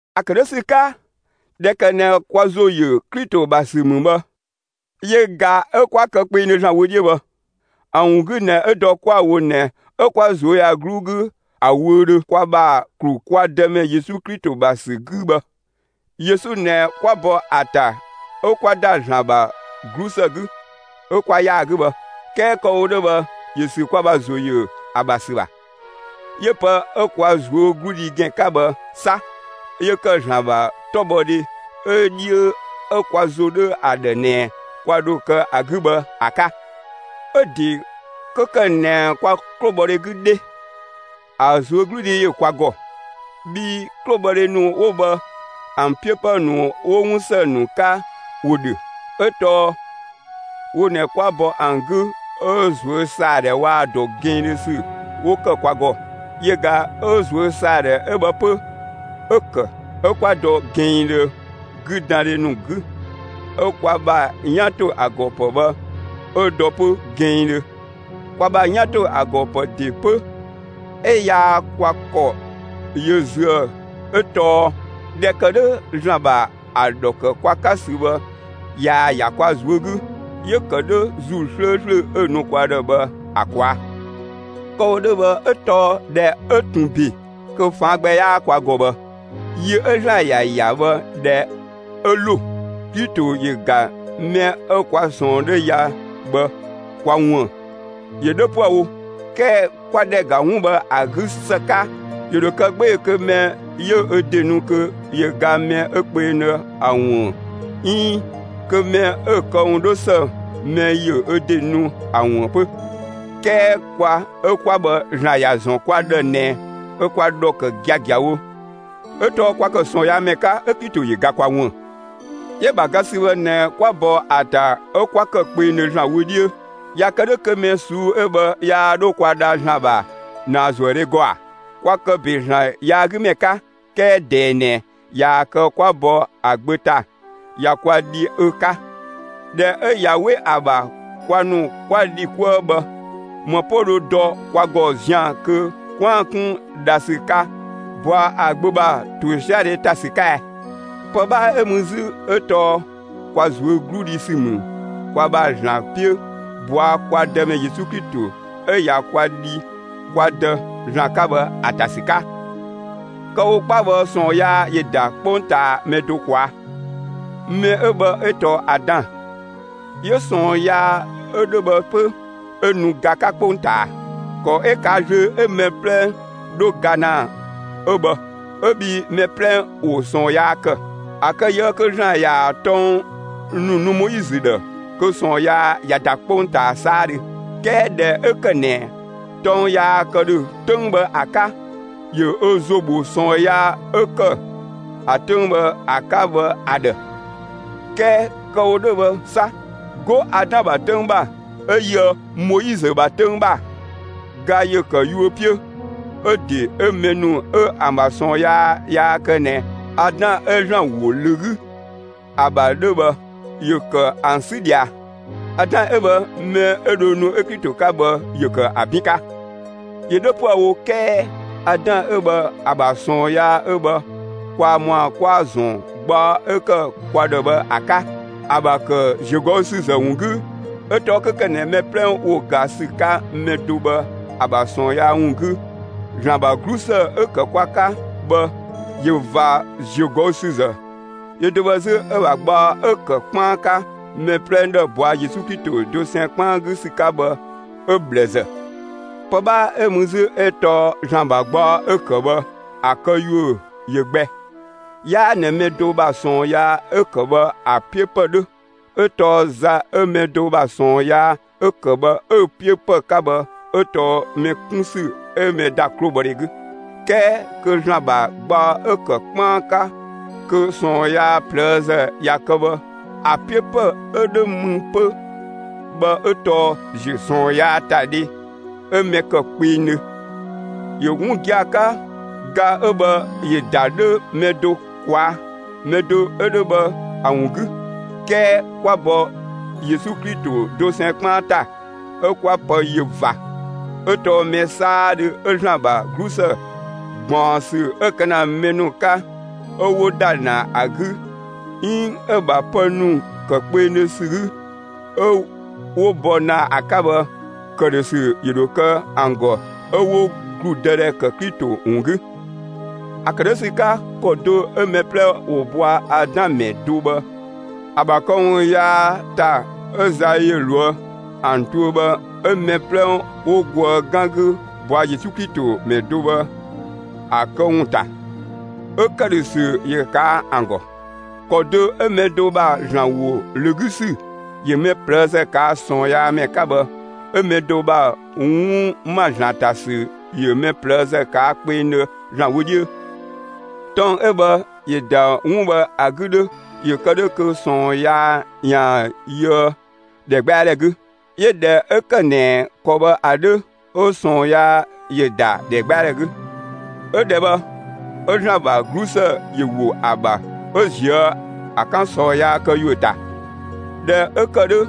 ‑A ‑kë 'dhö ‑sü 'ka, ꞊dhɛ ‑kë ꞊nɛ kwa ‑zo ‑yö Klito ‑bha ‑sü ‑mü bhë, yö ꞊ga 'ö 'kwa kë kpengdhö ‑Zlan wö 'dhiö bhë. ‑A ‑wun 'gü ꞊nɛ 'ö dɔ 'kwa‑ wo ꞊nɛ 'ö 'kwa ꞊zuöyagluu 'gü ‑a wöödhö kwa ‑bha ‑klu kwa Dëmɛ Yesu Klito ‑bha ‑sü 'gü bhë. Yesu ꞊nɛ 'kwa bɔ ‑a ‑ta 'ö 'kwa ‑da ‑Zlan ‑bha 'glusë 'gü, 'ö 'kwa ‑yaa 'gü bhë. 'Kɛɛ kë‑ wo 'dhö bhë ‑yö ‑sü kwa ‑bha ‑zo ‑yö ‑a ‑bha ‑sü ‑bha. 'Yö pë 'ö kwa ꞊zuögludhi ‑gɛn 'ka bhë 'sa 'yö ‑kë ‑Zlan ‑bha 'tɔbhɔdhe 'ö 'dhiö 'ö kwa ‑zo 'dhö ‑a ‑dhë ꞊nɛ kwa ‑dho kë ‑a 'gü bhë ‑a 'ka. 'Ö‑ ‑de 'kö ‑kë ꞊nɛ kwa 'klobhɔdhe 'gü 'dhe, ‑a ꞊zuögludhi ‑yö kwa ‑gɔ; bhii 'klobhɔdhe ‑nu 'wo bhë ‑an 'piö ‑pë ‑nu 'wo 'wun ‑së ‑nu 'ka ‑wo ‑dhö; 'ö tɔɔ wo ꞊nɛ 'kwa bɔ ‑an 'gü 'ö ꞊zuösaadhɛ waa‑ ‑dɔ diindhö ‑sü 'wo ‑kë kwa ‑gɔ. Yö ꞊ga 'ö ꞊zuösaadhɛ 'ö bhë 'pö, 'ö‑ ‑kë 'ö 'kwa dɔ gɛnngdhö 'güdandhe ‑nu 'gü 'ö kwa ‑bha 'yan ‑to ‑a ‑gɔ ‑pë bhë 'ö dɔ 'pö gɛnngdhö. Kwa ‑bha 'yan ‑to ‑a ‑gɔ ‑pë ‑de 'pö 'ö 'yaa kwa ‑kɔ yö züë 'ö tɔɔ ꞊dhɛ ‑kë 'dhö, ‑Zlan ‑bha ‑a ‑dhɔ ‑kë kwa 'ka ‑sü bhë, ꞊yaa‑ ‑ya kwa ꞊zuö' 'gü; 'yö‑ ‑kë 'dhö ‑Zuu 'slööslö 'ö‑ nu kwa ‑dhë bhë ‑a ꞊kwaa'. Kë‑ wo 'dhö bhë 'ö tɔɔ ꞊dhɛ 'ö ꞊tun ‑be kö ꞊faan' gbɛ 'yaa kwa ‑gɔ bhë, yi 'ö ‑Zlan ‑ya ‑ya bhë, ꞊dhɛ 'ö ‑lo, Klito ‑yö ‑ga mɛ 'ö kwa ꞊sɔɔn 'dhö ya bhë kwa ꞊wuën'. ‑Yö 'dhö 'püë‑ wo; 'kɛɛ 'kwa ‑dhɛ ‑ga 'wun bhë ‑a 'gü ‑së 'ka, ‑yö ‑dho kë 'gbee‑ kö mɛ ‑yö ö ‑de nu kö ‑yö ga mɛ 'ö kpengdhö ‑a ꞊wuën'; 'iin kö mɛ 'ö‑ këwun 'dhö ‑së, mɛ ‑yö ö ‑de nu ‑a ꞊wuën' 'pö. 'Kɛɛ kwa 'ö 'kwa bhë, ‑Zlan ‑ya ‑zɔn kwa ‑dhë ꞊nɛ ö kwa ‑dhɔ ‑kë giagiawo, 'ö tɔɔ kwa ‑kë ꞊sɔɔnyaamɛ 'ka, 'ö Klito ‑yö ga kwa ꞊wuën'. 'Yö‑ ‑bha ga ‑sü bhë ꞊nɛ kwa bɔ ‑a ‑ta 'ö 'kwa ‑kë kpengdhö ‑Zlan wö 'dhiö; ꞊ya kë 'dhö kö mɛ ꞊suu'‑ 'ö bhë yaa 'dho kwa dha ‑Zlan ‑bha ‑naazuëdhe ‑gɔ ‑a? Kwa ‑kë ‑be ‑Zlan yaagümɛ 'ka; 'kɛɛ ꞊dɛɛ ꞊nɛ ꞊yaa‑ kë 'kwa bɔ ‑a Gbö ‑ta, ꞊ya kwa dhi ö 'ka. ꞊Dhɛ 'ö ꞊ya 'we ‑a ‑bha kwa ‑nu 'kwa dhi 'kuë‑ bhë, ‑më 'pö dho dɔ kwa ‑gɔ zian‑ kö 'kwaan‑ 'kun dhasü 'ka ꞊bɔa' ‑a Gbö ‑bha ‑tosiadhe ‑ta ‑sü 'ka ɛ? Pë 'bhaa 'ö mü 'zü 'ö tɔɔ kwa ꞊zuögludhi ‑sü ‑mü kwa ‑bha ‑Zlan 'piö ꞊bɔa' kwa Dëmɛ Yesu Klito 'ö ꞊ya kwa dhi (kwa Dë) ‑Zlan 'ka bhë ‑a ‑ta ‑sü 'ka. Kë‑ wo 'kpa bhë, ꞊sɔɔn yaa ‑yö ‑da 'kpongtaa mɛ do ꞊kwaa'‑. Mɛ 'ö bhë 'ö tɔɔ Adan. 'Yö ꞊sɔɔn yaa 'ö 'dhö bhë 'pö, 'ö nu ga 'ka 'kpongtaa. ‑Kɔ 'ö ꞊kaa' ꞊zlöö 'ö mɛ 'plɛ 'dho ga ‑na 'ö bhë 'ö bhii mɛ 'plɛ ‑wo ꞊sɔɔn yaa kë. ‑A kë ꞊yië' kö ‑Zlan ‑yaan tɔng ‑nu nu Moizö ‑dhë, kö ꞊sɔɔn yaa ꞊ya ‑da 'kpongtaa 'saadhö; 'kɛɛ ꞊dhɛ 'ö ‑kë ꞊nɛ tɔng yaa kë ‑dhö 'töng bhë ‑a 'ka, ‑yö ö ‑zo ‑bho ꞊sɔɔn yaa 'ö ‑kë ‑a 'töng bhë ‑a 'ka bhë ‑a ‑dhë. 'Kɛɛ kö kë‑ wo 'dhö bhë 'sa, 'go Adan ‑bha 'töng ‑bha 'ö yöë Moizö ‑bha 'töng ‑bha, ga ‑yö ‑kë yuö 'piö; 'ö‑ ‑de 'ö mɛ ‑nu 'ö ‑an ‑bha ꞊sɔɔn yaa yaa kë ꞊nɛ Adan 'ö ‑Zlan ‑wo ‑lö 'gü ‑a ‑bha 'dhö bhë, 'yö ‑kë ‑an 'sü ꞊dhia. Adan 'ö bhë, mɛ 'ö dho nu 'ö Klito 'ka bhë, ‑yö ‑kë ‑a 'bin 'ka. ‑Yö 'dhö 'püë‑ wo 'kɛɛ Adan 'ö bhë, ‑a ‑bha ꞊sɔɔn yaa 'ö bhë kwaa ‑mɔa 'kwa‑ ‑zɔn gbaɔ 'ö ‑kë kwa ‑dhë bhë ‑a 'ka, ‑a ‑bha ‑kë ‑ziögɔüsüzë ‑wun 'gü. 'Ö tɔɔ 'kö ‑kë ꞊nɛ mɛ 'plɛ ‑wo ga ‑sü 'ka mɛ do bhë ‑a ‑bha ꞊sɔɔn yaa ‑wun 'gü, ‑Zlan ‑bha 'glusë 'ö‑ ‑kë kwa 'ka bhë, ꞊yö ꞊va ‑ziögɔüsüzë; yö do bhë 'zü 'ö‑ ‑bha gbaɔ 'ö‑ ‑kë ('kpaan 'ka) mɛ 'plɛ ‑dhë ꞊bɔa' Yesu Klito dosɛn 'kpaan 'gü ‑sü 'ka bhë, 'ö ꞊bhlëzë. Pë 'bhaa 'ö mü 'zü 'ö tɔɔ ‑Zlan ‑bha gbaɔ 'ö‑ kë bhë, ‑a këyuö ꞊yö gbɛ. 'Yaa ꞊nɛ mɛ do ‑bha ꞊sɔɔn yaa 'ö ‑kë bhë ‑a 'piö ‑pë 'dhö; 'ö tɔɔ za 'ö mɛ do ‑bha ꞊sɔɔn yaa 'ö‑ ‑kë bhë 'ö‑ 'piö ‑pë 'ka bhë 'ö tɔɔ mɛ 'kun ‑sü 'ö mɛ ‑da 'klobhɔdhe 'gü, 'kɛɛ kö ‑Zlan ‑bha gbaɔ 'ö‑ ‑kë 'kpaan 'ka kö ꞊sɔɔn yaa ꞊plëëzë ꞊ya kë bhë, ‑a 'piö ‑pë 'ö 'dhö mü 'pö bhë 'ö tɔɔ ‑ziö ꞊sɔɔn yaa ‑ta dhe 'ö mɛ ‑kë kpengdhö. ‑Yö 'wun gia‑ 'ka, ga 'ö bhë ‑yö ‑da 'dhö mɛ do ꞊kwaa', mɛ do 'ö 'dhö bhë ‑a ‑wun 'gü. 'Kɛɛ kwa ‑bɔ Yesu Klito dosɛn 'kpaan ‑ta 'ö 'kwa pë yö ꞊va. 'Ö tɔɔ mɛ 'saadhö 'ö ‑Zlan ‑bha 'glusë ꞊gbaɔnsü 'ö‑ kë ‑na mɛ ‑nu 'ka 'ö 'wo ‑da ‑na ‑a 'gü 'iin 'ö‑ ‑bha pë ‑nu ‑kë kpengdhö ‑sü 'gü 'ö 'wo bɔ ‑na ‑a 'ka bhë, ‑këdhösü ‑yö ‑dho kë ‑an ‑gɔ 'ö 'wo ‑gludëdhɛ kë Klito ‑wun 'gü. ‑A ‑kë 'dhö ‑sü 'ka, ‑kɔ do 'ö mɛ 'plɛ ‑wo bɔa Adan mɛ do bhë ‑a ‑bha këwun yaa ‑ta 'ö za ‑yö ꞊loë' ‑an tuö bhë 'ö mɛ 'plɛ ‑wo goë 'gan 'gü ꞊bɔa' Yesu Klito mɛ do bhë ‑a këwun ‑ta, 'ö ‑këdhösü ‑yö ꞊kaa' ‑an ‑gɔ. ‑Kɔ do 'ö mɛ do ‑bha ‑Zlan ‑wo ‑lö 'gü ‑sü ‑yö mɛ ꞊plëëzë ꞊kaa' ꞊sɔɔnyaamɛ 'ka bhë, 'ö mɛ do ‑bha 'wun ‑ma ‑Zlan ‑ta ‑sü ‑yö mɛ ꞊plëëzë ꞊kaa' kpengdhö ‑Zlan wö 'dhiö. Tɔng 'ö bhë, ‑yö ‑da 'wun bhë ‑a 'gü 'dhö ‑yö kë 'dhö kö ꞊sɔɔn yaa ‑yaan yöë ‑dhɛgbɛadhɛ 'gü. 'Yö ꞊dhɛ 'ö ‑kë ꞊nɛ ‑kɔ bhë ‑a 'dhö 'ö ꞊sɔɔn yaa ‑yö ‑da ‑dhɛgbɛadhɛ 'gü; 'ö ‑dhɛ bhë, 'ö ‑Zlan ‑bha 'glusë ‑yö ‑wo ‑a ‑bha 'ö ‑ziö ‑a 'ka ꞊sɔɔn yaa këyuö ‑ta. ꞊Dhɛ 'ö ‑kë 'dhö,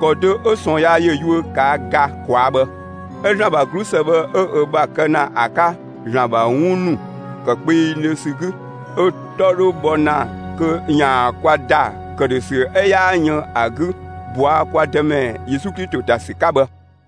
‑kɔ do 'ö ꞊sɔɔn yaa ‑yö yuö ꞊kaa' ga ꞊kwaa' bhë, 'ö ‑Zlan ‑bha 'glusë bhë 'ö ö ‑bha kë ‑na ‑a 'ka ‑Zlan ‑bha 'wun ‑nu ‑kë kpengdhö ‑sü 'gü, 'ö‑ 'tɔ 'dhö bhɔ ‑na kö ‑yaan kwa ‑da ‑këdhösü 'ö 'yaa yën ‑a 'gü ꞊bɔa' kwa Dëmɛ Yesu Klito ‑ta ‑sü 'ka bhë.